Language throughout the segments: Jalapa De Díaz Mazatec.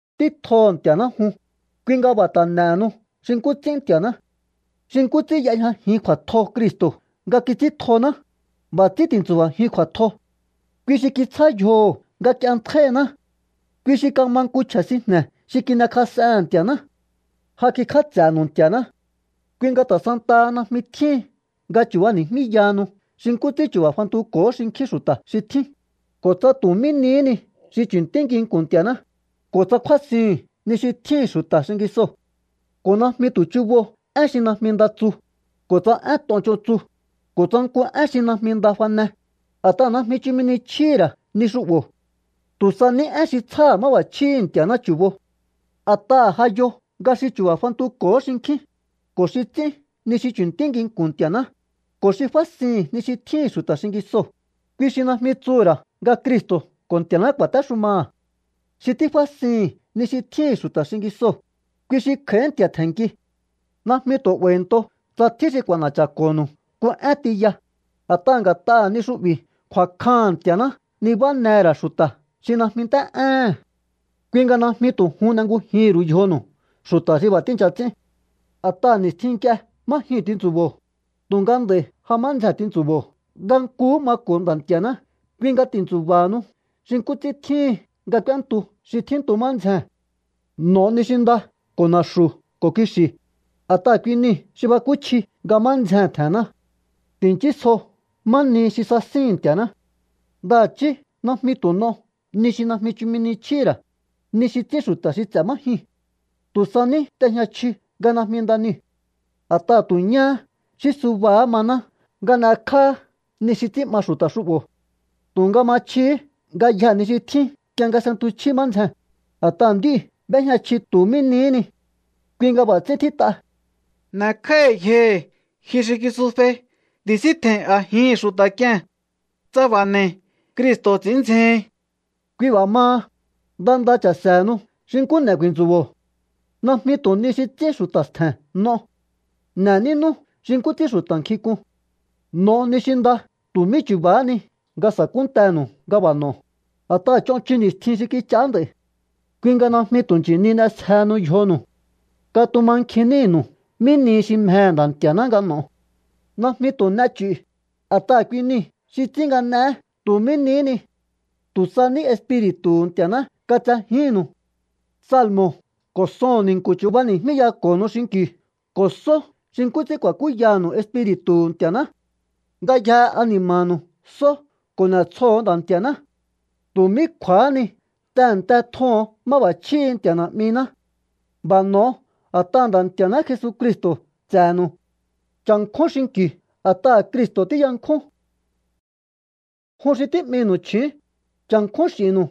Ntí tjoho̱ Nti̱a̱ná jun, kui nga b'a̱ ta̱ n'e̱henu xi nkú ts'ín Nti̱a̱ná. Xi nkú ts'ín y'ejñajin kju̱a̱tjo Cristo̱ nga kits'íntjoná, b'a̱ ts'ín ti̱ntsu̱ba̱jiun kju̱a̱tjo. Kui xi kitsjá yjoho̱ nga k'ienntjáíhiná. Kui xi kama nku chje̱ sinjne̱ xi kin'ekjas'ehe̱n Nti̱a̱ná. Ja kikj'áts'e̱nu̱u Nti̱a̱ná. Kui nga ta̱ santaha najmi tjíhin nga chu̱bani̱jmíyahanu xi nkú ts'ín chu̱ba̱ fantuko̱hó xinkjín xu̱ta̱ xi tjín, ko̱ tsa tu̱ mí nihí ni xi chu̱ntí nginku̱n Nti̱a̱ná, ko̱ tsa kjúásihu̱un ni xi tjíhi̱n xu̱ta̱ xingisoo̱. Ko̱ najmi tu̱ chubo én xi najmi nda tsu, ko̱ tsa én ton ch'on tsu, ko̱ tsa nku én xi najmi nda fane, a̱t'aha̱ najmi chumi ni chjíhi̱ ra̱ ni xu'bo̱. Tu̱ sa ní én xi tsjáha̱ máb'a̱chjíhi̱ Nti̱a̱ná chu̱bo. A̱t'aha̱ ja yo nga xi chu̱ba̱ fantuko̱hó xinkjín, ko̱ xi ts'ín ni xi chu̱ntí nginku̱n Nti̱a̱ná, ko̱ xi fásihi̱n ni xi tjíhi̱n xu̱ta̱ xingisoo̱, kui xi najmi tsuhu̱ ra̱ nga Cristo̱ ko̱ Nti̱a̱ná ku̱a̱téxumaha̱. Xi tífásihi̱n ni xi tjíhi̱n xu̱ta̱ xingisoo̱, kui xi kj'a̱í nti̱a̱ tje̱nnki. Najmi tu̱ 'ba̱i̱nto tsa tjín xi k'u̱a̱na̱cha̱ko̱nu̱u nku én tiya, a̱t'aha̱ nga̱t'aha̱ ni xu'bi̱ kju̱a̱kjaha̱n Nti̱a̱ná nibánehe̱ ra̱ xu̱ta̱ xi najmi nt'é'éhe̱n. Kui nga najmi tu̱ jun n'engujihi̱n ru̱u yjonu̱u xu̱ta̱ xi b'a̱ tíi̱ncha ts'ín. A̱t'aha̱ ni̱stjin nk'ie má jyuu̱n tintsu̱bo̱o, tu̱nga nd'a̱i̱ ja má ndzjee̱n tintsu̱bo̱o nga nkuhú mako̱o Nda̱ Nti̱a̱ná. Kui nga ti̱ntsu̱ba̱hanu xi nkú ts'ín tjíhin nga k'úéntu xi tjíntu má ndzjee̱n. N'o̱o ni xi nda ko̱ na̱xu̱ ko̱ kixi̱, a̱t'aha̱ kui niu̱ xi bakúchji nga má ndzjee̱n tje̱he̱nná. Ti̱nchísjo má nihi xi sasíhi̱n Nti̱a̱ná. Ndaha̱chí najmi tu̱ n'o ni xi najmi chumi ni chjíhi̱ ra̱, ni xi ts'ín xu̱ta̱ xi ts'e̱ má jyuu̱n. Tu̱ sa ní t'e̱jñachiu nga najmi nda niu̱. A̱t'aha̱ tu̱ ñáhá xí subahá maná nga n'ekjáá ni xi ts'ín'ma xu̱ta̱ xu'bo̱. Tu̱nga ma chjihí ngayjee̱ ni xi tjín nk'ie nga s'entuchjí má ndzjee̱n, a̱t'aha̱ nd'íu̱ b'éjña chji tu̱ mí nihí ni. Kui nga b'a̱ ts'ín tjít'a: N'e̱kj'áíhi̱ yjohi̱, ji xi kisufei. Ti̱síntje̱i̱n a̱jihi̱n xu̱ta̱k'ie̱n. Tsa b'a̱ n'e̱i̱, Cristo̱ ts'i̱ín ndzjehin. Kui b'a̱ maha, nda nda cha̱se̱henu xi nkú n'e ku̱i̱ntsu̱bo̱o. Najmi tu̱ ni xi ts'ín xu̱ta̱ stje̱n n'o. N'e̱ nínú xi nkú ts'ín xu̱ta̱ nkjink'un. N'o̱o ni xi nda tu̱ mí chu̱ba̱há ni nga sa̱kúntenu̱u nga b'a̱ n'o̱o, a̱t'aha̱ ch'on chun ni̱stjin xi kich'aá nd'a̱i̱. Kui nga najmi tu̱ nchi̱ni n'esjehenu yjonu̱u. Katumankjin nínu̱u mí nihi xi mjehe̱ Nda̱ Nti̱a̱ná nga n'o̱o. Najmi tu̱ n'e ch'i̱u, a̱t'aha̱ kui niu̱ xi ts'ín nga n'eé tu̱ mí nihí ni. Tu̱ sa ní Espiri̱tu̱hu̱ Nti̱a̱ná katsejíhi̱nnu̱u. Salmo̱ ko̱ soho̱n ni̱nku̱ chu̱bani̱jmíyako̱honu xinki̱u ko̱ só xi nkú ts'ín ku̱a̱kúyanu̱u Espiri̱tu̱hu̱ Nti̱a̱ná. Ngayjehe ani̱ma̱nu̱u só ko̱ n'e̱tsjoho̱o Nda̱ Nti̱a̱ná. Tu̱ mí kju̱a̱há ni tehe̱nte tjoho̱on máb'a̱chjíhi̱ Nti̱a̱ Na̱'miná. B'a̱ n'o̱o a̱t'aha̱ Nda̱ Nti̱a̱ná Jesucristo̱ ts'e̱nu̱u. Cha̱nkjún xinki̱u a̱t'aha̱ Cristo̱ tíyankjún. Jun xi tí'minu̱u chju̱ún, cha̱nkjún x'i̱nnu̱u.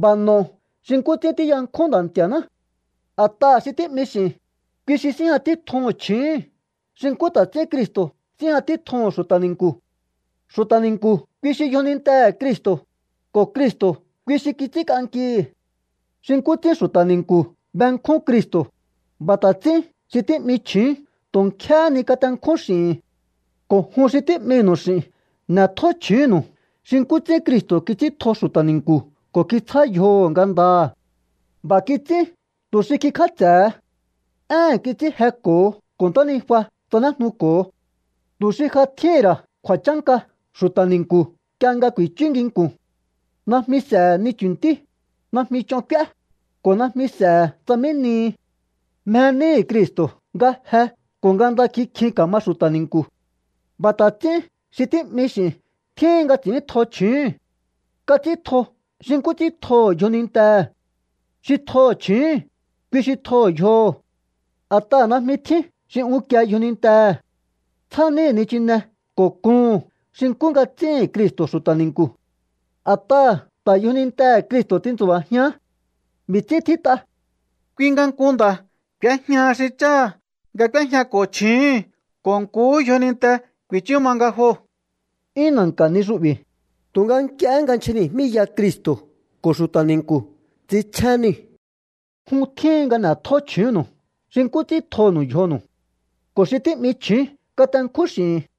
B'a̱ n'o̱o xi nkú ts'ín tíyankjún Nda̱ Nti̱a̱ná. A̱t'aha̱ xi tí'mi x'i̱n, kui xi síjña títjuhu̱n chju̱úhu̱n xi nkú ta̱ ts'ín Cristo̱ síjña títjuhu̱n xu̱ta̱ ni̱nku̱. Xu̱ta̱ ni̱nku̱ kui xi yjonintehe̱ Cristo̱, ko̱ Cristo̱ kui xi kits'ínk'ankihi̱. Xi nkú ts'ín xu̱ta̱ ni̱nku̱ benkjún Cristo̱, b'a̱ ta̱ ts'ín xi tí'mi chju̱ún tu̱ nkjéhé ni katenkjún x'i̱hi̱n. Ko̱ jun xi tí'minu̱u x'i̱n, n'e̱tjó chju̱únnu̱u xi nkú ts'ín Cristo̱ kits'íntjo xu̱ta̱ ni̱nku̱ ko̱ kitsjá yjoho̱ ngandaha̱. B'a̱ kits'ín tu̱ xi kikj'áts'e̱he. Éhe̱n kits'ín jeko̱ho ko̱ ntánijua tsanéjnuko̱ho tu̱ xi ja tjíhi̱n ra̱ kju̱a̱chánka xu̱ta̱ ni̱nku̱ nk'ie nga ku̱i̱chú nginku̱n. Najmi s'e̱he̱ ni chu̱ntí, najmi ch'on k'úé, ko̱ najmi s'e̱he̱ tsa mí nihi. Mje níhi̱ Cristo̱ nga je ko̱ nga nda kikjin ka̱ma xu̱ta̱ ni̱nku̱. B'a̱ ta̱ ts'ín xi tí'mi x'i̱n tjíhin nga ts'i̱íntjo chju̱úhu̱n. Kats'íntjo xi nkú ts'ín tjoho̱ yjonintehe̱. Xi tjoho̱ chju̱úhu̱n, kui xi tjoho̱ yjoho̱. A̱t'aha̱ najmi tjín xi unkie yjonintehe̱. Tsjá níhi̱ nichine ko̱ kuhu̱n xi nkú nga ts'íhi̱n Cristo̱ xu̱ta̱ ni̱nku̱. A̱t'aha̱ ta̱ yjonintehe̱ Cristo̱ tintsu̱ba̱jián. B'i̱ ts'ín tjít'a: “Kui nga nku nda̱ k'u̱éjñaha xi cháha̱ nga k'úéjñako̱ chju̱úhu̱n ko̱ nkuhú yjoninte ku̱i̱chú ma nga joo̱.” 'Yún na̱nka̱ ni xu'bi̱, tu̱nga nk'iehé nga nchjani̱jmíya Cristo̱ ko̱ xu̱ta̱ ni̱nku̱ ts'inchjén niu̱. Jun tjíhin nga n'e̱tjó chju̱únnu̱u xi nkú ts'ín tjonu̱u yjonu̱u. Ko̱ xi tí'mi chju̱ún katenkjún x'i̱hi̱n.